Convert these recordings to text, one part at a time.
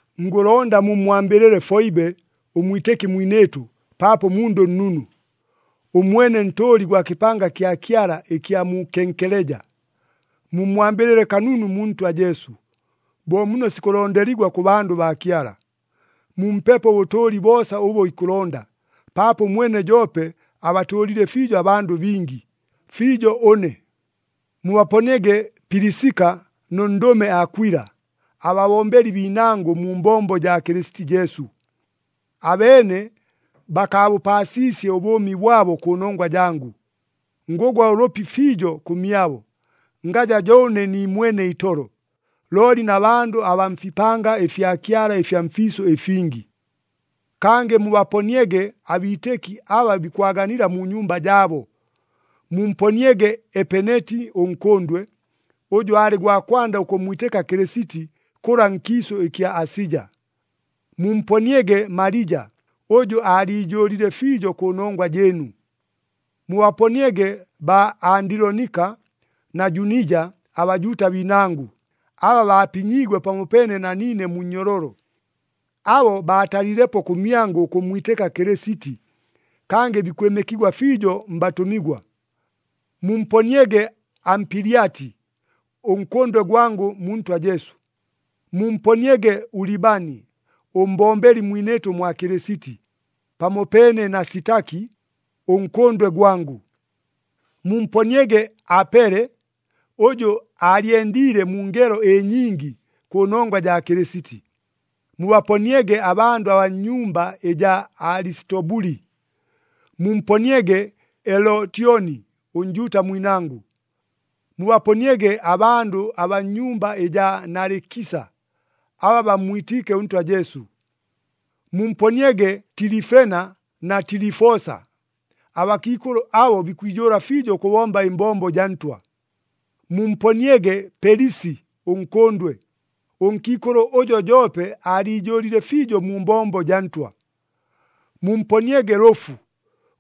Ngʉlonda mummwambɨlɨle Foibe ʉmwitɨki mwinɨɨtʉ paapo mundʉ nnunu. Ʉmwene ntʉʉli gwa kɨpanga kya Kyala ɨkya mu Kenkeleja. Mummwambɨlɨle kanunu mu Ntwa Jesu, bo muno sikʉlondeligwa kʉ bandʉ baa Kyala. Mumpepo ʉbʉtʉʉli boosa ʉbʉ ikʉlonda, paapo ʉmwene joope abatʉʉlile fiijo abandʉ bingi, fiijo ʉne. Mubaponiege Pilisika nʉ ndʉme Akwila, ababombeli biinangʉ mu mbombo jaa Kɨlɨsiti Jesu. Abeene bakaabʉpaasiisye ʉbʉʉmi bwabo kʉnongwa jangʉ. Ngʉgwa ʉlʉpi fiijo kʉmyabo, ngaja jo ʉne niimwene itolo, looli na bandʉ abaa mfipanga ɨfya Kyala ɨfya mfiisʉ ɨfingi. Kangɨ mubaponiege abiitɨki aba bikwaganila mu nyumba jaabo. Mumponiege Epeneti ʉnkʉndwe, ʉjʉ aalɨ gwa kwanda ʉkʉmmwitɨka Kɨlɨsiti kʉla nkiisʉ ɨkya Asija. Mumponiege Malija, ʉjʉ aaliijʉʉlile fiijo kʉnongwa jɨɨnu. Mubaponiege baa Andilonika na Junija aBajuuta biinangʉ, aba baapinyiigwe pamopeene na niine mu nnyololo. Abo baatalilepo kʉmyangʉ ʉkʉmmwitɨka Kɨlɨsiti, kangɨ bikwɨmɨkigwa fiijo mbatʉmigwa. Mumponiege Ampilyati, ʉnkʉndwe gwangʉ mu Ntwa Jesu. Mumponiege Ulibani, ʉmbombeli mwinɨɨtʉ mwa Kɨlɨsiti, pamopeene na Sitaki, ʉnkʉndwe gwangʉ. Mumponiege Apele, ʉjʉ aalyendiile mu ngelo ɨnyingi kʉnongwa jaa Kɨlɨsiti. Mubaponiege abandʉ abaa nnyumba ɨjaa Alisitobuli. Mumponiege Elotyoni ʉNjuuta mwinangʉ. Mubaponiege abandʉ abaa nnyumba ɨjaa Nalikisa, aba bammwitiike ʉNtwa Jesu. Mumponiege Tilifena na Tilifosa. Abakiikʉlʉ abo bikwijʉʉla fiijo ʉkʉbomba ɨmbombo jaa Ntwa. Mumponiege Pelisi ʉnkʉndwe, ʉnkiikʉlʉ ʉjʉ joope aaliijʉʉlile fiijo mu mbombo jaa Ntwa. Mumponiege Lʉfu,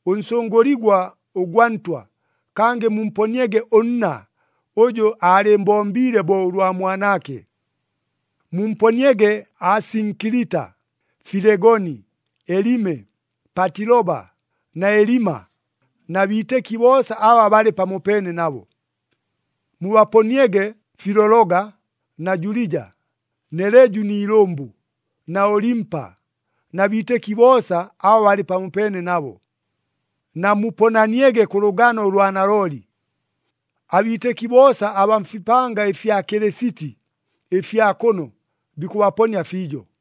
ʉnsʉngʉligwa ʉgwa Ntwa, kangɨ mumponiege ʉnna, ʉjʉ aalɨɨmbombiile bo ʉlwa mwanaake. Mumponiege Asinkilita, Filegoni, Elime, Patiloba na Elima, na biitɨki boosa aba balɨ pamopeene nabo. Mubaponiege Filologa na Julija, Neleju ni ilʉmbʉ, na Olimpa, na biitɨki boosa aba balɨ pamopeene nabo. Namuponaniege kʉ lʉgano ʉlwa nalooli. Abiitɨki boosa abaa mfipanga ɨfya Kɨlɨsiti ɨfya kʉno bikʉbaponia fiijo.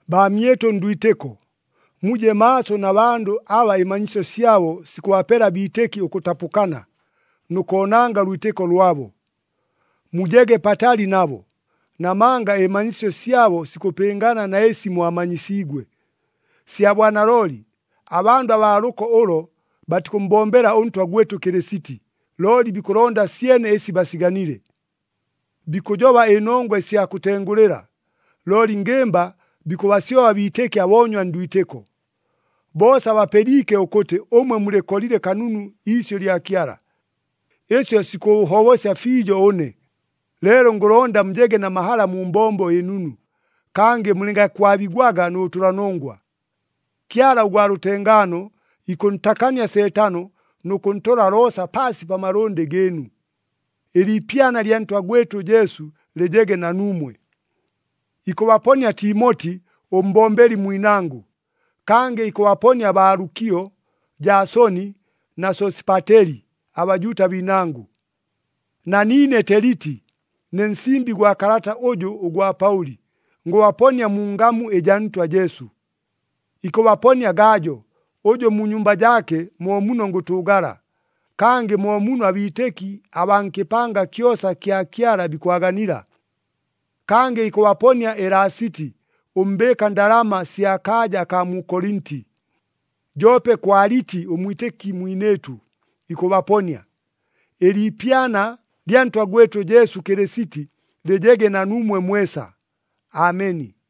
Baamyɨtʉ ndwitɨko, muje maaso na bandʉ aba ɨmanyisyo syabo sikʉbapela abiitɨki ʉkʉtapʉkana, nʉ koonanga ʉlwitɨko lwabo. Mujege patali nabo, namanga ɨmanyisyo syabo sikʉpɨngana na ɨsi mwamanyisiigwe. Sya bwanalooli, abandʉ abaa lʉko ʉlo batikʉmmbombela ʉNtwa gwɨtʉ Kɨlɨsiti, looli bikʉlonda syene ɨsi basiganile. Bikʉjoba ɨnongwa ɨsya kʉtengʉlɨla, looli ngɨmba bikʉbasyoba abiitɨki aboonywa ndwitɨko. Boosa bapɨliike ʉkʉtɨ ʉmwe mulɨkolile kanunu iisyʉ ɨlya Kyala. Ɨsyo sikʉʉhobosya fiijo ʉne, leelo ngʉlonda mujege na mahala mu mbombo ɨnunu, kangɨ mulɨngakwabigwaga nʉ bʉtʉlanongwa. Kyala ʉgwa lʉtengaano ikʉntakania Seetano nʉ kʉntola loosa paasi pa malʉndɨ gɨɨnu. Ɨliipyana lya Ntwa gwɨtʉ Jesu lɨjege na nuumwe. Ikʉbaponia Timoti ʉmbombeli mwinangʉ. Kangɨ bikʉbaponia baa Lukio, Jaasoni na Sosipateli, aBajuuta biinangʉ. Na niine Teliti, ne nsimbi gwa kalata ʉjʉ ʉgwa Paʉli, ngʉbaponia mu ngamu ɨjaa Ntwa Jesu. Ikʉbaponia Gajo ʉjʉ mu nyumba jaake mo muno ngʉtʉʉgala, kangɨ mo muno abiitɨki abaa nkɨpanga kyosa kya Kyala bikwaganila. Kangɨ ikʉbaponia Elasiti ʉmbɨɨka ndalama sya kaaja akaa mu Kolinti. Joope Kwaliti ʉmwitɨki mwinɨɨtʉ, ikʉbaponia. [ Ɨliipyana lya Ntwa gwɨtʉ Jesu Kɨlɨsiti lɨjege na nuumwe mwesa. Ameni.]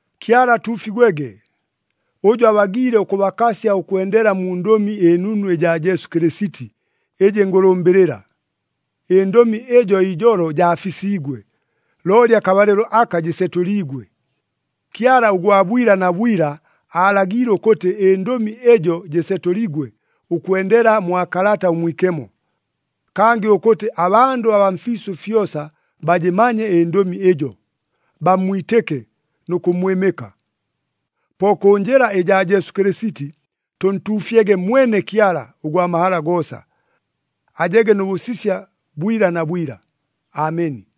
Kyala atuufigwege! Ʉjʉ abagiile ʉkʉbakasya ʉkwendela mu Ndʉmi ɨNunu ɨjaa Jesu Kɨlɨsiti, ɨjɨ ngʉlʉmbɨlɨla. Ɨndʉmi ɨjo ijolo jaafisiigwe, looli akabalɨlo aka jɨsetʉliigwe. Kyala ʉgwa bwila na bwila aalagiile ʉkʉtɨ ɨndʉmi ɨjo jɨsetʉligwe ʉkwendela mwa Kalata ʉMwikemo. Kangɨ ʉkʉtɨ abandʉ abaa mfiisʉ fyosa bajɨmanye ɨndʉmi ɨjo, bammwitɨke nʉ kʉmmwɨmɨka. Po kʉ njɨla ɨjaa Jesu Kɨlɨsiti, tʉntuufyege mwene Kyala ʉgwa mahala goosa. Ajege nʉ bʉsisya bwila na bwila! Ameni.